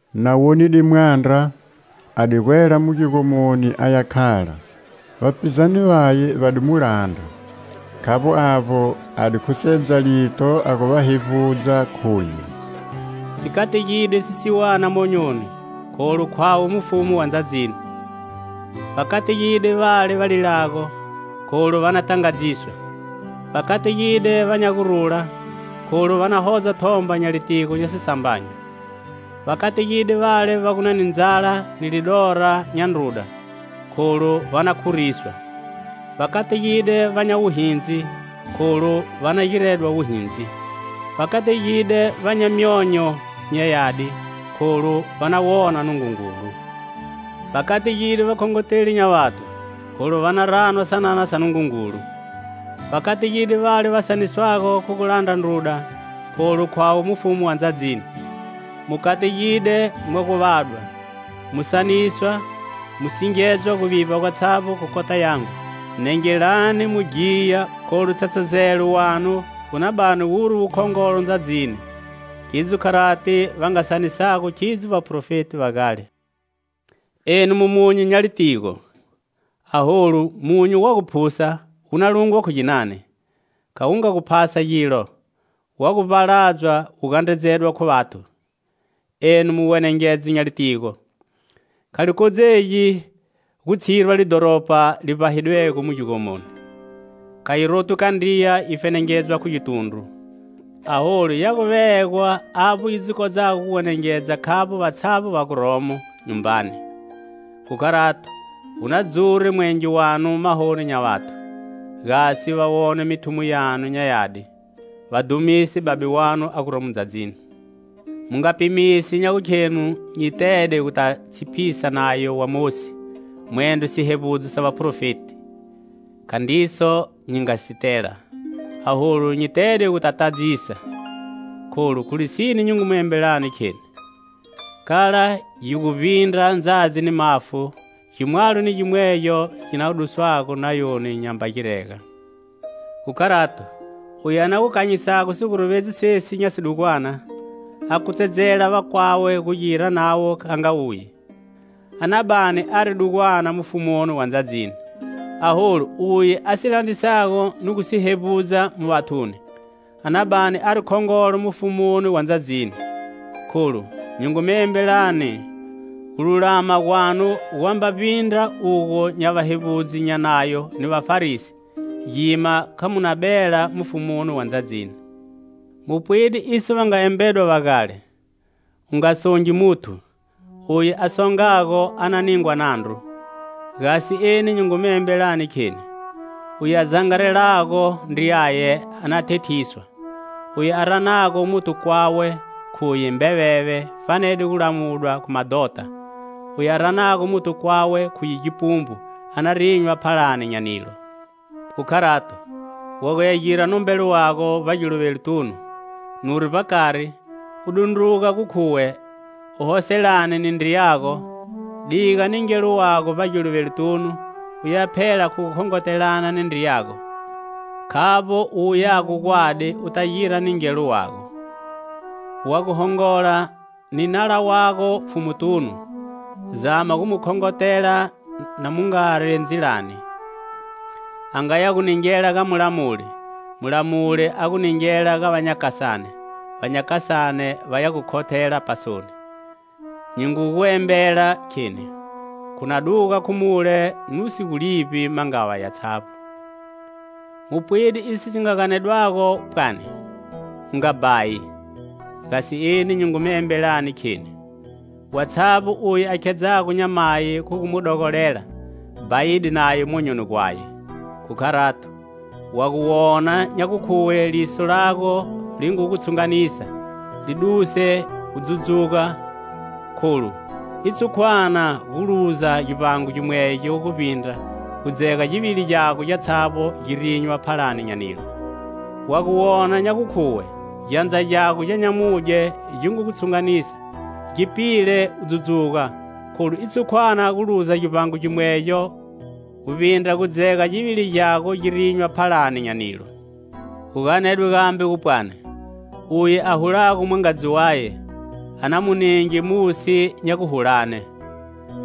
Na wonide mwandra, a di gwela mu gigomoni a ya khala. Vapizane vaye va di mu landra. Khavbo avbo, a di khusedza lito a gu va hevbudza, khuye: "Si kategide sisiwana monyoni,kholu khwawe Mufumu wa ndzadzini. Va kategide vale va lilago,kholu va na tangadziswa. Va kategide va nya gurula,kholu va na hodza thomba nya litigo nya sisambanyo. Va kategide vale va gu ni ndzala ni lidora nya ndruda,kholu va na khuriswa. Va kategide va nya wuhindzi,kholu va na giredwa wuhindzi. Va kategide va nya myonyo nya yadi,kholu va na wona Nungungulu. Va kategide vakhongoteli nya vathu,kholu va na ranwa sanana sa Nungungulu. Va kategide vale va saniswago khu gu landra ndruda, kholu khwawe mufumu wa ndzadzini. "Mu kategide, mwa gu vadwa, mu saniswa, mu singedzwa guvivba gwatshavbo khu kota yangu. "Nengelani mu ghiya, kholu tshatshazelo wanu wu na bani wuri wukhongolo ndzadzini. Khidzo kharati va nga sanisago khidzo vaprofeti va gale. "Enu mu munyu nya litigo! Aholu munyu wa gu phusa, wu na lungwa khu ginani? Kha wu nga gu phasa gilo; wa gu vbaladzwa, wu gandredzedwa khu vathu. "Enu mu wenengedzo nya litigo! Kha li kodzegi gu tshirwa lidhoropa li vbahidwego mu gigomoni. Kha yi rotwhi kandriya yi fenengedzwa khu gitundru, aholu ya gu vegwa avbo yi dzi kodzago gu wenengedza khavbo vatshavbo va guromo nyumbani. Khu kharato wu na dzure mwenge wanu mahoni nya vathu, gasi, va wone mithumo yanu nya yadi, va dhumise Babe wanu a guromo ndzadzini. Mu nga pimisi nya gukhenu nyi tede guta tshipisa Nayo wa Mosi, mwendro sihevbudzo sa vaprofeti: Khandriso nyi nga si tela; aholu, nyi tede guta tadzisa. Kholu, khu lisine nyi ngu mu embelani, kheni: kala yi gu vbindra ndzadzi ni mafu, gimwalo ni gimwegyo gi na gu duswago Nayoni nyamba girega. Khu kharato, uye a na gu kanyisago siguruvedzo sesi nya sidugwana, a kutsedzela vakwawe gu gira navo nga uye, a na bani ari dugwana mufumuni wa ndzadzini. Aholu uye a si landrisago ni gu si hevbudza mu vathuni, a na bani ari khongolo mufumuni wa ndzadzini. Kholu nyi ngu mu embelani; gululama gwanu gwamba vbindra ugo nya vahevbudzi nya Nayo ni Vafarisi, gima kha mu na bela mufumuni wa ndzadzini. "Mu pwide iso va nga embedwa va gale: 'U nga songi muthu; uye a songago a na ningwa nandru.' Gasi eni nyi ngu mi embelani, kheni: uye a zangarelago ndriyaye a na thethiswa; uye a ranago muthu kwawe khuye mbeveve fanede gu lamudwa khu madhota. Uye a ranago muthu kwawe khuye gipumbu a na rinywa phalani nya nilo. Khu kharato, wa guya gira nombelo wago vbagiluvelotunu, nuri vbakari, u dundruga gu khuwe u hoselane ni ndriyago, diga ningelo wago vbagiluvelotunu, uya phela khu gu khongotelana ni ndriyago; khavbo u wuyago gwadi u ta gira ningelo wago. "Wa gu hongola ni nala wago pfhumutunu, zama gu mu khongotela na mungari ndzilani; a nga ya gu ningela ga mulamuli, mulamuli a gu ningela ga vanyakasane, vanyakasane va ya gu khothela pasoni. Nyi ngu gu embela, kheni: khu na duga khu mule nu si gu livbi mangava yatshavbo. "Mu pwide iso si nga ganedwago pwani: 'U nga bhayi.' Gasi eni nyi ngu mi embelani, kheni: watshavbo uye a khedzago nyamayi, khu gu mu dogolela, bhayide naye monyoni gwaye. Khu kharato, wa gu wona nya gukhuwe liso lago li ngu gu tshunganisa, li duse u dzudzuga, kholu i tshukwana gu luza givbango gimwegyo, guvbindra gu dzega givili gyago gyatshavbo gi rinywa phalani nya nilo. Wa gu wona nya gukhuwe gyandza gyago gya nyamudye gi ngu gu tshunganisa, gi pile u dzudzuga, kholu i tshukwana gu luza givbango gimwegyo, guvbindra gu dzega givili gyago gi rinywa phalani nya nilo. "Gu ganedwe gambe gu pwani: 'Uye a hulago mwangadzi waye, a na mu ni nge musi nya guhulane.'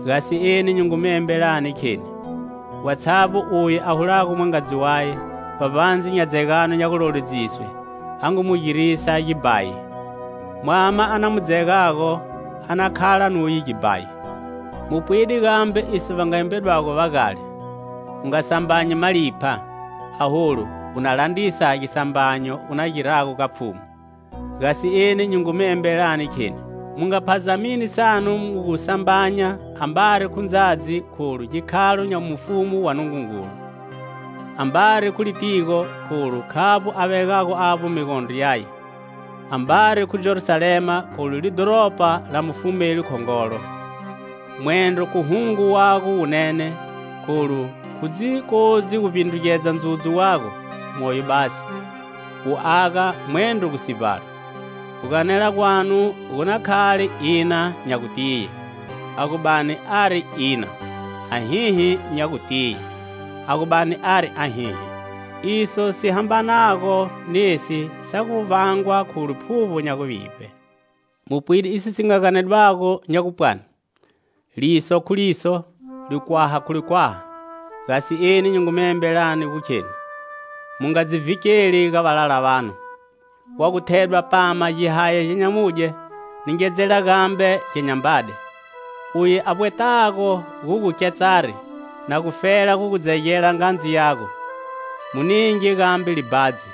Gasi eni nyi ngu mi embelani, kheni: watshavbo uye a hulago mwangadzi waye, vbavbandze nya dzegano nya guloledziswe, a ngu mu girisa gibhayi. Mwama a na mu dzegago a na khala nuye gibhayi. "Mu pwide gambe iso va nga embedwago va gale. 'U nga sambanyi malipha, aholu u na landrisa gisambanyo u na girago ga Pfhumu.' Gasi eni nyi ngu mu embelani kheni: mu nga phazamini sanu mu gu sambanya, ambari khu ndzadzi, kholu gikhalo nya Mufumu wa Nungungulu; ambari khu litigo, kholu khavbo a vegago avbo migondro yaye; ambari khu Jerusalema, kholu lidhoropa la mufumeli khongolo, mwendro khu hungo wago wunene, kholu khu dzi kodzi gu vbindrugedza ndzudzu wago, moyo basi, wu aga mwendro gu sivbala. Guganela gwanu gu na khale ina nya gutiye, a gu bani ari ina; ahihi nya gutiye, a gu bani ari ahihi. Iso si hambanago nesi sa gu vangwa khu liphuvbo nya guvivbe. "Mu pwide iso si nga ganedwa, nya gupwani: 'Liso khu liso, likhwaha khu likhwaha.' Gasi eni nyi ngu mi embelani gu kheni: mu nga dzi vhikeli ga valala vanu. Wa gu thedwa pama gihaya gya nyamudye, ningedzela gambe gya nyambade. Uye a vbwetago gu gu ketsari, na gufela gu gu dzegela ngandzu yago, mu ninge gambe libhadzi.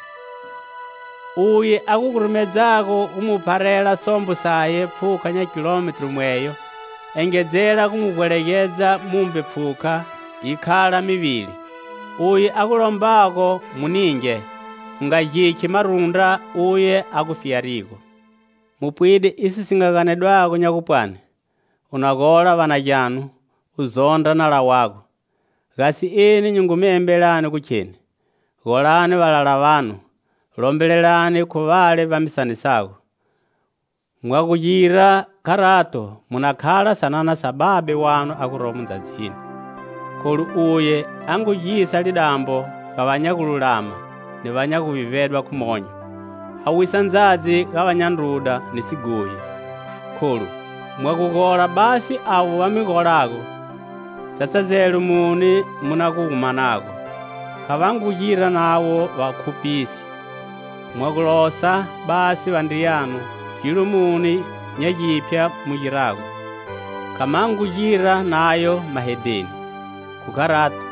Uye a gu gurumedzago gu mu pharela sombo saye pfhuka nya kilometru mweyo, engedzela gu mu vbwegedza mumbe pfhuka yi khala mivili. Uye a gu lombago mu ninge. U nga gikhi marundra uye a gu fiyarigo. "Mu pwide iso si nga ganedwa nya gupwani: 'U na gola va na gyanu, u zondra nala wago.' Gasi eni nyi ngu mi embelani gu kheni: golani valala vanu; lombelelani khu vale va mi sanisago. Mwa gu gira kharato mu na khala sanana sa Babe wanu a guromo ndzadzini. Kholu uye a ngu gisa lidambo ga va nya gululama ni va nya guvivbedwa khu monyo; a wisa ndzadzi ga va nya ndruda ni sighohi. Kholu, mwa gu gola basi avo va mi golago, tshatshazelo muni mu na gu wu manago? Kha va ngu gira navo vakhuphisi? Mwa gu losa basi vandriyanu, gilo muni nya giphya mu girago? Kha ma ngu gira nayo mahedheni? Khu kharato,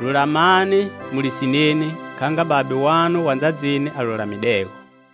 lulamani mu lisineni kha nga Babe wanu wa ndzadzini a lulamidego.